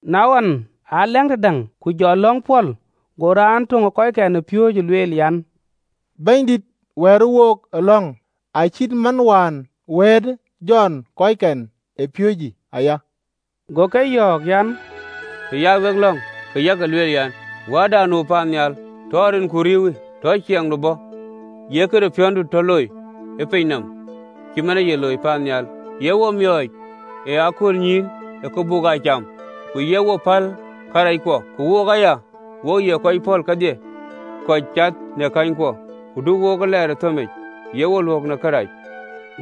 Na wën, a lɛ̈ŋ tëdäŋ, ku jɔ lɔ̈ŋ pɔ̈l, go raan töŋ ë kɔckɛn ë piööcë lueel an, “Bɛ̈nydït, wɛ̈ɛ̈të wook ë lɔ̈ŋ, acït man wëëtë Jɔn kɔckɛn ë piööcë aya.” Go ke yɔ̈ɔ̈k an, “Të ya wek lɔ̈ŋ, ke yak lueel an, ‘Wäärda nu paannhial, tɔ rinku riëëuwë. Tɔ ciɛɛŋdu bɔ̈. Ye këde piɔ̈ndu tɔ loi ë piny nɔm, cït man ee ye looi paannhial. Ye wo miɔɔc ë aköölnyïïn ë kë buk aa cam. Ku ye wo päl karɛckuɔ, ku wook aya wo ye kɔc pɔ̈l kedhie kɔc cath në känykuɔ. Ku du wook ee lɛɛr ë thëmic, ye wo luök ë kërac.”’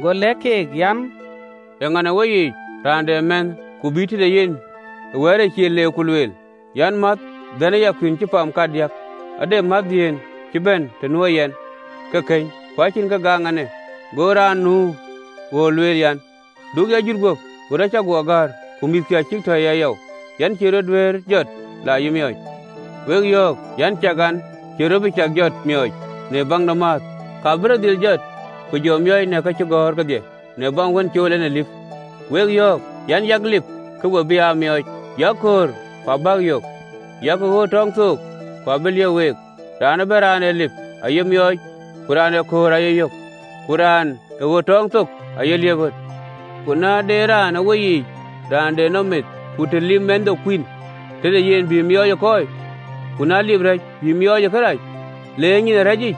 Go lɛ̈k keek an, “Eeŋa në weyiic, raan de mɛ̈thë, ku bï lɔ tëde yen ë wɛ̈ɛ̈ric cil, ku lueel an, ‘Mäth, dhɛ̈në ya kuïïn cï pam kadiäk. Ade mɛ̈thëdiën cï bɛ̈n të nuö yɛn, ke këny, ku acïn kë gɔɔŋ ɛn en!’ Go raan nu ɣööt lueel an, ‘Du ya jut guöp! Ɣöt acï guɔ gäär, ku mïthkï acïk tɔ̈c ë yayɔu në agen nɔm, yɛn cïï rɔt duëër jɔt, la yï miɔɔc?’ Wek yɔ̈ɔ̈k an, Ciɛk, an, cïï rɔt bï cak jɔt, miɔɔc, në baŋ de määth, ka bï rɔt dhil jɔt ku jɔ miɔɔc në ka kɔɔr kedhie, në baŋ wën cool en ë lip. Ku wek yɔ̈ɔ̈k an: Yak lip, ke we bï aa miɔɔc, yak köör, ku abäk aa yök, yak ɣöt tɔɔŋ thok, ku abï liëp week. Raan ëbɛ̈n raan ee lip, aaye miɔɔc, ku raan ee köör ee yök, ku raan ë ɣöt tɔɔŋ thok aye liep ɣöt. Ku na de raan ë weyiic raan de nɔm mïth, ku të lip mɛnhde kuïn tëde yen, bï miɔɔc ë kɔɔi? Ku na lip rɛ̈c, bï miɔɔc ë kërac, le ë nyin ë rɛ̈cic?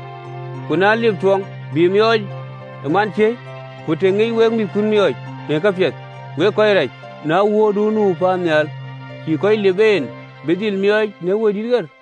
Ku na lip tuɔŋ, bï miɔɔc ë manciëëi? Ku të ŋiɛc wek mïthkun miɔɔc në kapiɛth, wek kɔc rac, na Wuöörduön nu paannhial cïï kɔc lip en bï dhil miɔɔc në Wëidït ɣer!”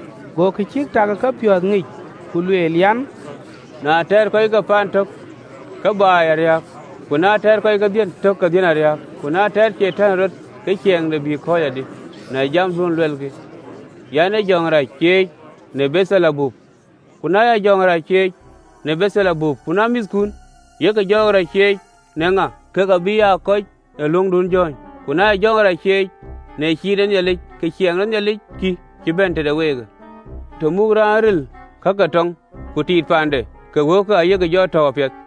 Go kë cïk tak ë kepiɔ̈ɔ̈th ŋic, ku lueel an, “Na teer kɔc ke ciɛɛŋ tök ke ciɛɛŋ aa riääk, ku na teer kɔc ke dhiën tök ke dhiën aa riääk. Ku na teer Catan ë rɔt, ke ciɛɛŋde bï kɔ̈ɔ̈c adï? Në jamduön luɛlkï an, aa jɔɔk rac cieec në Beeldhebub. Ku na ya jɔɔk rac cieec në Beeldhebub, ku na mïthkun, yek jɔɔk rac cieec në ŋa? Keek abïk aa kɔc ë löŋdun jɔ̈ɔ̈ny. Ku na ya jɔɔk rac cieec në ciin ë Nhialic, ke ciɛɛŋ de Nhialic kï, cï bɛ̈n tëde weekë. “Të muk raan ril ka ke tɔŋ ku tiit paande, ke wëuke ayek jɔ tɔ̈u apiɛth.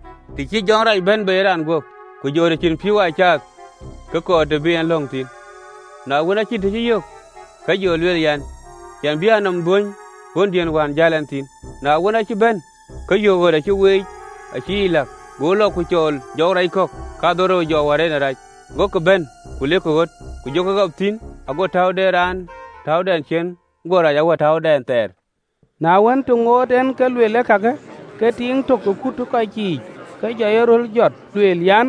“Të cï jɔŋ rac bɛ̈n bei ë raan guöp, ke jɔ të cïn pïïu aa caath, ke kɔɔr të bï en lɔ̈ŋ thïn, na wën, aa cïn të cï yök, ke lueel an, ‘Yɛn bï a nɔm dhuöny ɣöndiën wään jäl ɛn thïn.’ Na wën, aacï bɛ̈n, ke yök ɣöt acï weec ka acï yic läk. Go lɔ, ku cɔl jɔɔk rac kɔ̈k kadhorou jɔɔk wär en ë rac, gokï bɛ̈n, ku lek ɣöt, ku jɔ ɣap thïn, ago täu de raanë täudɛn ciëën go rac awär täudɛn thɛɛr.” Na wën, të ŋoot en ke lueel, kakë, ke tiiŋ tök ë kut ë kɔc yiic ke jɔ yeröl jɔt, lueel an,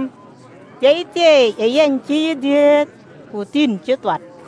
“Thieithieei ë yäny ë dhiëëth, ku thïn cï thuat!”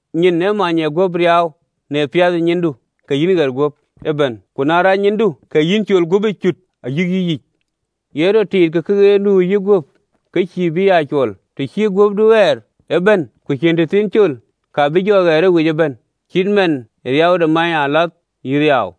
Nyin ee many ee guöp riaau, na piath nyindu, ke yïn ɣer guöp ëbɛ̈n, ku na rac nyindu, ke yïn col guöp ë cut ayïk yïyic. Ye rɔt tiit ke këɣeer nu ë yïguöp ke cïï bï aa cuɔl. Të cï guöpdu ɣɛɛr ëbɛ̈n, ku cïn tëthiin col, ka bï jɔ ɣɛɛr ë wic ëbɛ̈n, cït man ee riau de manyëalath yï riaau.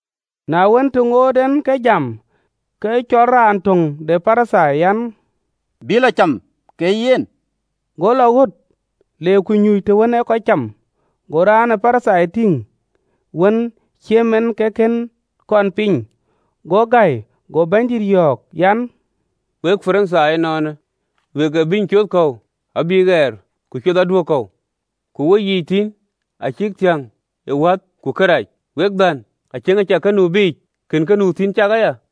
Na wën, të ŋoot en ke jam, ke cɔɔl raan töŋ de Parithai an, bï lɔ cam ke yen, go lɔ ɣöt, le ku nyuuc tën ee kɔc cam. Go raan ë Parithai tïŋ wën ciëm en ke kën kɔn piny, go gäi. Go Bɛ̈nydït yɔ̈ɔ̈k an, “Wek Parithai ënɔɔnë, wek ee bïny coth kɔ̈u abï piath, ku cuɔthkï aduök kɔ̈u, ku weyiic thïn acïk thiäŋ ë wäth ku kërac. Wek dhän! Aciëŋ ë cäk kë nu biic, kën kë nu thïn cak aya?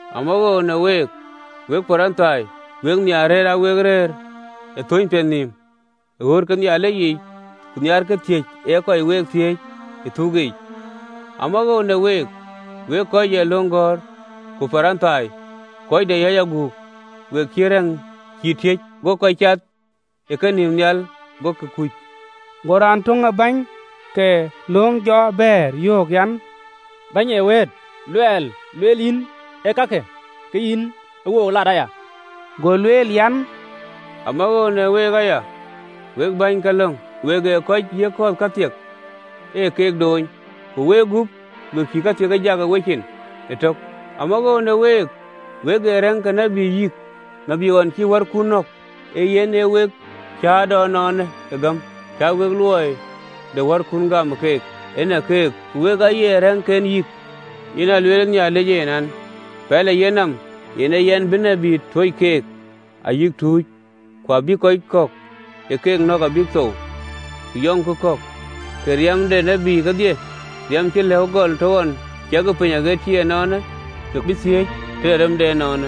“Amawoou në week, wek Parithai! Wek nhiaar rëër aa wek rëër ë thöny piɛth nïïm ë ɣööt ke Nhialic yiic, ku nhiaarkï thiëc ee kɔc week thiëëc ë thuk yiic. Amawoou në week! Wek kɔc ee löŋ gɔ̈ɔ̈r ku Parithai, kɔc de yäc aguk! Wek cït rɛ̈ŋ cïï tiëc, go kɔc aa cath ë kenïïm nhial ke kuckï.” Go raan tök ë bäny ke löŋ jɔ bɛ̈ɛ̈r, yöök an, “Bɛ̈ny ee wëët, luɛl lueel yïn ee kakë, ke yïn ë wook lat aya!” Go lueel an, “Amawoou në week aya, wek bäny ke löŋ! Wek ee kɔc yiëk kɔ̈ɔ̈th kathiek ë ke doony, ku wegup we cïï kathiek ë jak ë ciin tök. Amawoou në week! Wek ee rɛ̈ŋ ke tït yïk, tït ɣɔn cïï wärkun nɔ̈k. Ee yic, wek ee cäätɔɔ ënɔɔnë ë gäm cä wek luɔi de wärkun gam, ee kek ë näk keek, ku wek aye rɛ̈ŋken yïk. Yen a lueelë Nhialic En në pɛl ë yenɔm an, ‘Yɛn bï tït tuöc keek ayï tuuc, ku abïk kɔc kɔ̈k ë keek nɔ̈k abïk thou, ku yɔŋkï kɔ̈k.’ Ke riɛm de tït kedhie riɛm cï lëu gɔl të ɣɔn ciɛkë piny aɣët cï ënɔɔnë, ke bï thiëëc tëde rem de ënɔɔnë,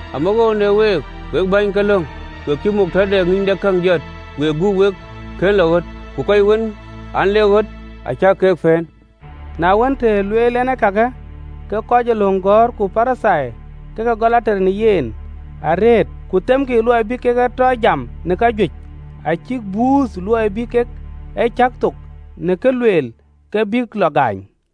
“Amawoou në week, wek bäny ke löŋ! Wek cï gäärgäär de ŋïnydekäŋ jɔt, wegup wek kën lɔ ɣöt, ku kɔc wën an, lek ɣöt, acäk ke pëën!” Na wën, të lueel en kakë, ke kɔc ee löŋ gɔ̈ɔ̈r ku Parithai ke ke gɔl ater në yen arëët, ku themkï luɔi bï kek e tɔ jam në kajuëc, acïk buuth, luɔi bï kek e cäk thok në kë lueel, ke bïk lɔ gaany.